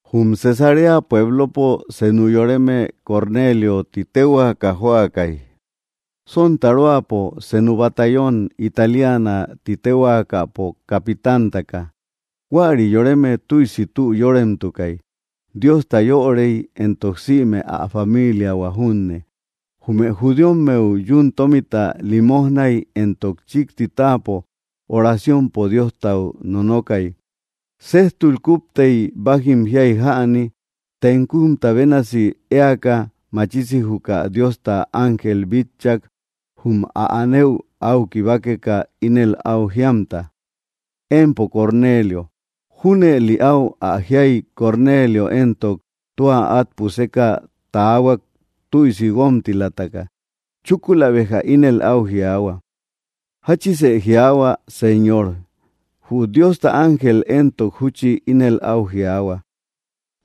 Jum Cesarea puéblopo senu yoreme Cornéliö ti téhuaka jóakai, sontaróapo senu batallón Italiana ti téhuaakapo capitántaka. Huäri yoreme tüisi tü yóremtukai, Diosta yörei, éntok sïme ä familiahua junne. Jume judíommeu yún tómita lilimojnay, éntok chikti táapo oraciompo Diostau nonokay. Séjtul kuptei, bájim jiai jäni, tenkumta bénasi éaka machisi juka Diosta ángel bitchak jum ä anëu au kibákeka, ínel au jíamta: —¡Empo Cornelio! Júnëli au ä jiai Cornelio éntok, tua at puseka taahuak tüisi guómtilataka. Chúkula béja ínel au jiaahua: —¿Jáchisë jiaahua, Señor? Jü Diosta ángel éntok, júchi ínel au jiaahua: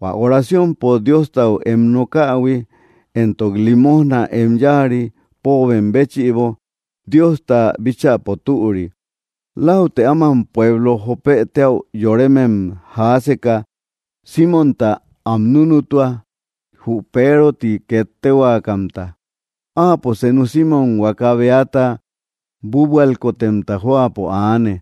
—Huä oraciompo Diostau em nókähui, éntok limojna em yáari póobem béchïbo, Diosta bíchäpo türi. Láutë áman pueblo Jópe téäu yorémem jaáseka Símonta am núnutua, jú Peero ti ket téhuakamta. Áapo senu Simmom huaka beata búabualkotemta jóapo aane,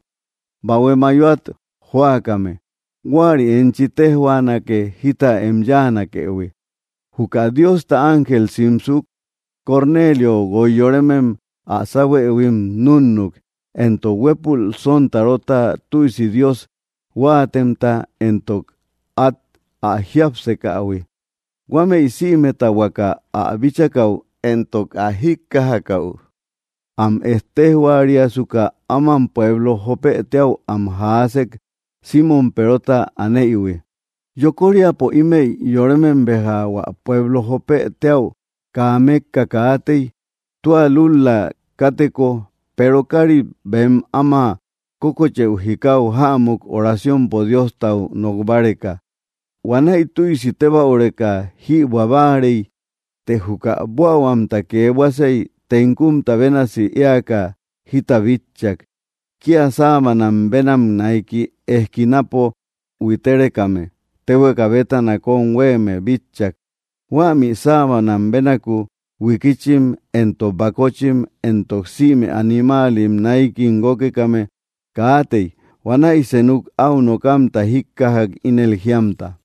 bahue mayoat jóakame. Huäri enchi téjhuaanake jita em yáanakëhui. Juka Diosta ángel simsuk, Cornelio guoi yorémem ä sáuhuëhuim núnnuk, éntok huépul sontarota tüisi Dios huáatemta éntok át ä jiapsekähui. Huámëi sïmeta huaka ä bíchakäu éntok ä jíkkajakäu am ettéjhuariasuka áman pueblo Jópë téäu am jaásek, Simmom Perota anéïhui. Yokóriapo ímëi yorémem béja hua pueblo Jópë téäu kaa mekka katéi, tua lúl‑la káteko Peero kárit bem áma kókocheú jikáu jämuk oraciompo Diostau nók báreka. Huanäi tüisi tébäureka jïbuä báarei, të juka buähuamta kee buasei, tenkumta bénasi éaka jita bitchak. Kia sábanam bénam naiki eskinapo huitérekame téhueka bétana kom huéeme bitchak. Huämi sábanam bénaku huikíchim, éntok bakóchim, éntok sïme animáalim náikim guókekame kaatei. Huanäi senuk au nokamta jíkkajak ínel jíamta: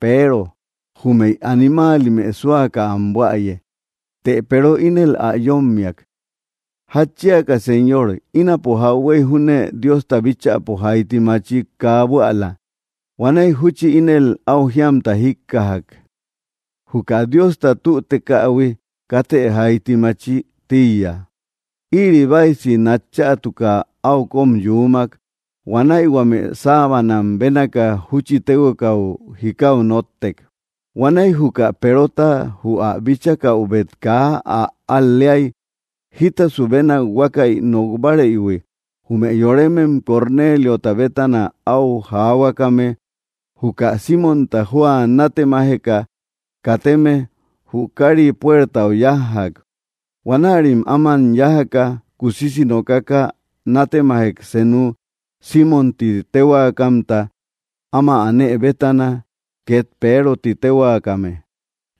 —Peero, júmëi animáalimë súaka am buäye. Të Peero ínel ä yómmiak: —¿Jatchíaka, Señor? Ínapo jauhuey júne Diosta bíchäpo jaiti machik kaa buäla. Huanäi júchi ínel au jíamta jíkkajak: —Juka Diosta tütekahui katë jaiti máchï tíiya. Ïri báisi nat chätuka au kom yúmak. Huanäi huame sábanam bénaka júchi téhuekau jikáu nóttek. Huanäi juka Perota jü ä bíchakäubet kaa ä al‑leai jítasu bénak huákäi nokbárëihui, jume yorémem Corneliota bétana au jaahuakame juka Símonta jóa nátemajeka kateme jü kári puertau yájjak. Huanärim áman yájaka kusisi nokaka nátemajek senuk Simmom ti téhuakamta áma anë bétana, ket Peero ti téhuakame.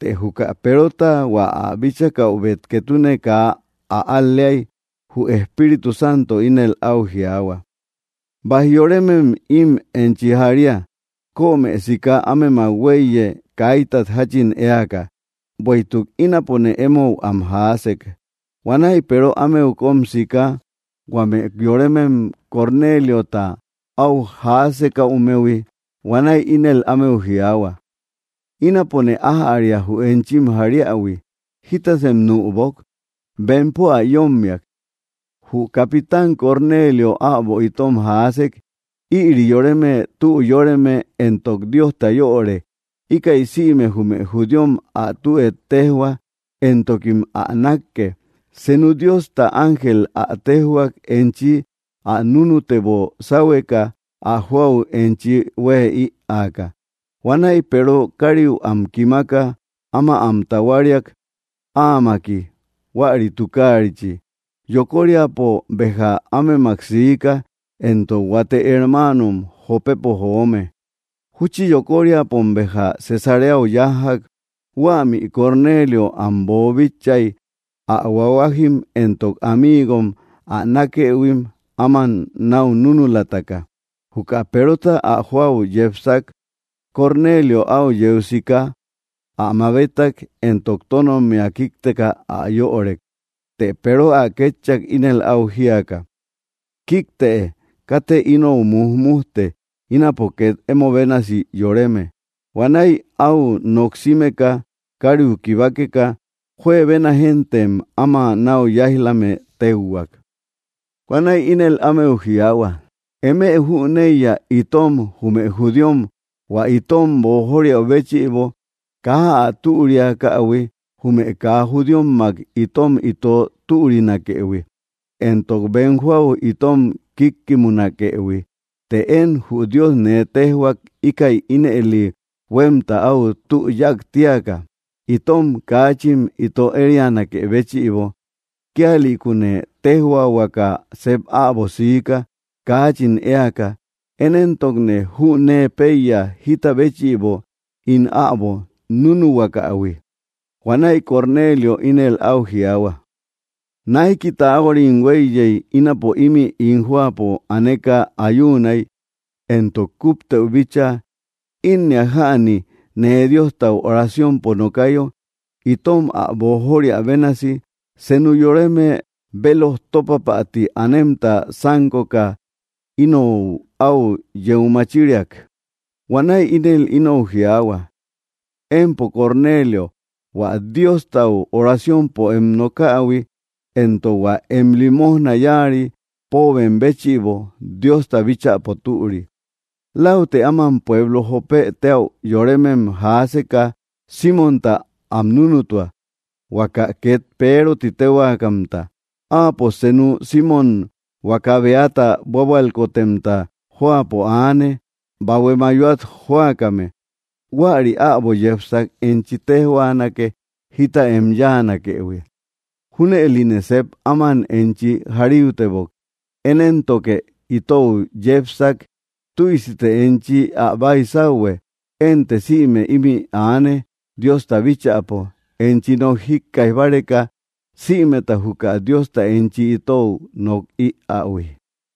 Të juka Perota hua ä bíchakäubet ketune kaa ä al‑leai, jü Espíritu Santo ínel au jiaahua: —Baij yoremem im enchi jaría. Kömë siká ámemak huéiye kaítat jachin éaka, bueïtuk ínapone emou am jaásek. Huanäi Peero ámeu kom siika huame yorémem Cornéliota au jaásekäumehui. Huanäi ínel ámeu jiaahua: —Ínapone ájäria jü enchim jaríähui. ¿Jítasem nübok? Bempo ä yómmiak: —Jü capitán Cornélio äbo itom jaásek, ïri yoreme tü yóreme éntok Diosta yöre íkäi sïme jume judíom ä tü éttejhua, éntokim ä nakke. Senu Diosta ángel ä téjhuak enchi ä núnutebo sáhueka ä joau enchi hueë ïaaka. Huanäi Peero kariu am kimaka, áma am tahuáriak áamaki huäri tukarichi. Yokóriapo béja ámemak siika, éntok huate hermáanom Jópepo joome. Júchi yokoriapom béja Cesareau yájjak. Huämi Cornelio am boobíchaïhuii ä huahuájim éntok amiigom ä nákëhuim áman nau núnulataka. Juka Perota ä joau yepsak, Cornelio au yeu siká ä mabétak, éntok tónommia kíkteka ä yörek. Të Peero ä kétchak ínel au jíaka: —Kíktë. Katë inou mújmujte. Ínapo ket emo bénasi yoreme. Huanäi au noksímeka, kariu kibákeka juebena géntem áma nau yáij‑lame téuhuak. Huanäi ínel ámeu jiaahua: —Eme jüneiya itom jume judíom, hua itom boojóriäu béchïbo, kaa ä türiakähui jume kaa judíommak itom ito türinakëhui, éntok bem joau itom kíkkimunakëhui. Teé én jü Dios nee téjhuak íkäi ínëli huemta au tü yáak tíaka, itom kaachin ito érianakë béchïbo. Kíalïkune téjhuaahuaka sep äbo siika kaachin éaka. Én éntokne jünee péiya jita béchïbo ín äbo núnuhuakahui. Huanäi Cornelio ínel au jiaahua: —Naiki taáhuarim huéiye ínapo imi ín jóapo aneka ayúunai, éntok kupteu bícha, ínneak jäni, nee Diostau oraciompo nokayo, itom ä boojóriä bénasi, senu yoreme béloj tópapäti anemta sánkoka inou au yeu machíriak. Huanäi ínel inou jiaahua: “Empo Cornelio, hua Diostau oraciompo em nokähui, éntok hua em limojna yáari póobem béchïbo Diosta bíchäpo türi. Láutë áman pueblo Jopë téäu yorémem jaaseka Símonta am núnutua, huaka ket Peero ti téhuakamta. Áapo senu Simmom huaka beata búabualkotemta jóapo aane, bahué mayóat jóakame. Huäri äbo yepsak enchi téjhuanake jita em yáanakëhui.” Júnëline sep áman enchi jaríutebok. Én éntoke itou yépsak. Tüisite enchi ä baisauhue. Ente sïme imi aane Diosta bíchäpo enchi nok jíkkaij báreka sïmeta juka Diosta enchi itou nok iähui.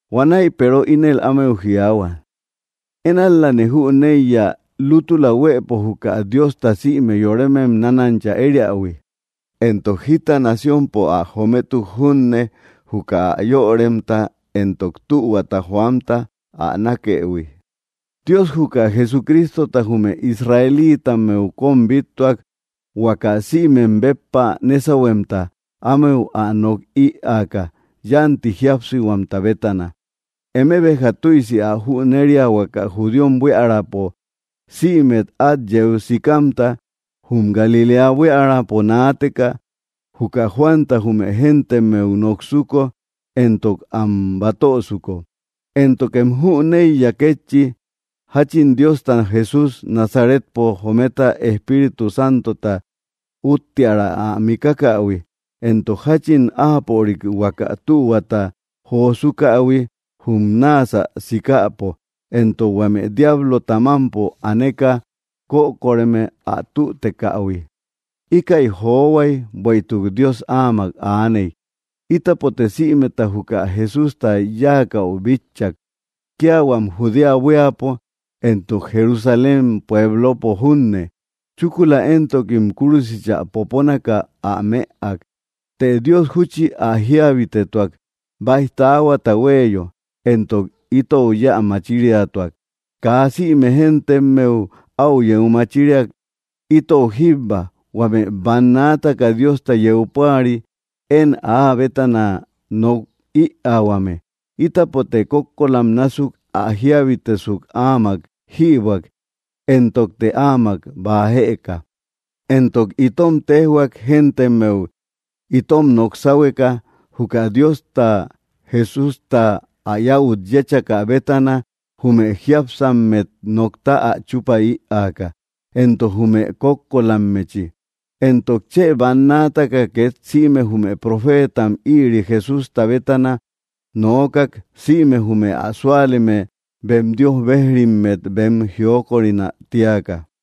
Huanäi Peero ínel ámeu jiaahua: —Én ál‑lane jüneiya lútula huëpo juka Diosta sïme yorémem nánancha ériähui, éntok jita naciónpo ä jométuk junne juka ä yöremta éntok tühuata joamta ä nákëhui. Dios juka Jesucrístota jume Israelítammeu kom bíttuak, huaka sïmem béppa nésauhuemta, ámeu ä nok ïaaka yanti jíapsihuamta bétana. Eme béja tüisi ä jüneria huaka judíom buíaräpo sïme át yeu sikamta jum Galiléa buíaräpo naateka juka Juanta jume géntemmeu noksuko éntok am batösuko. Éntokem jüneiya kétchi jachin Diosta Jesús Nazaretpo jometa Espíritu Santota útteara ä mikákähui, éntok jachin áapörik huaka tühuata josúkähui jum náasä sikäpo, éntok huame diáblota mampo aneka kökoreme ä tütekähui. Íkäi johuai bueïtuk Dios áamak aaney. Ítapote sïmeta juka Jesústa yáakäu bitchak, kia huam Judea buíapo éntok Jerusalén puéblopo junne. Chúkula éntokim kúrusichä popónaka ä mëak. Të Dios júchi ä jíabitetuak baij taáhuata huéeyo, éntok itou yéä machíriatuak. Kaa sïme géntemmeu au yeu machíriak, itou jíbba, huame bannaataka Diosta yeu púari én áa bétana nok ïaahuame. Ítapote kókoolam násuk ä jíabitesuk áamak jïbuäk, éntokte áamak baa jëka. Éntok itom téjhuak géntemmeu itom nok sáhueka, juka Diosta Jesústa ä yäut yéchakä bétana jume jiápsammet nokta ä chupa ïaka, éntok jume kókkolammechi. Éntok chë bannaataka ket sïme jume profétam ïri Jesústa bétana noókak sïme jume ä súaleme bem Dios bejrimmet bem jiókorinä tíaka.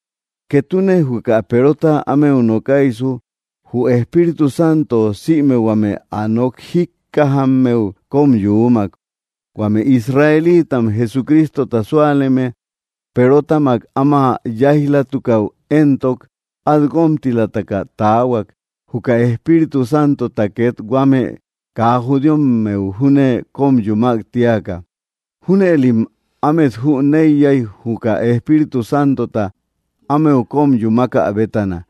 Ketune juka Perota ámeu nokaisu, jü Espíritu Santo sïme huame ä nok jíkkajammeu kom yuumak. Huame Israelitam Jesucrístota súaleme Perotamak áma yáij‑latukäu éntok, at guómtilamtaka taahuak juka Espíritu Santota ket huame kaa judíommeu júne kom yumák tíaka. Júnëlim ámet jüneiyai juka Espíritu Santota ámeu kom yumákä bétana,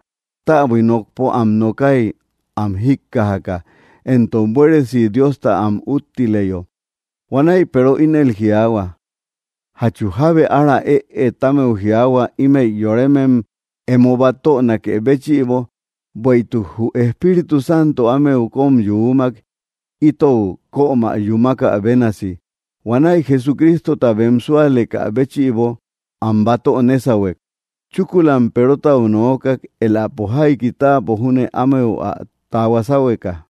täbui nokpo am nokái am jíkkajaka, éntok buéresi Diosta am úttileyo. Huanäi Peero ínel jiaahua: —¿Jatchu jábe ára ëe támeu jiaahua ímëi yorémem emo batönakë béchïbo? Bueïtuk jü Espíritu Santo ámeu kom yuumak itou kömä yúmakä bénasi. Huanäi Jesucrístota bem súalekä béchïbo am batö nésauhuek. Chúkulam Perotau nookak elapo jaiki tápo júne ámeu ä tahuá sáhueka.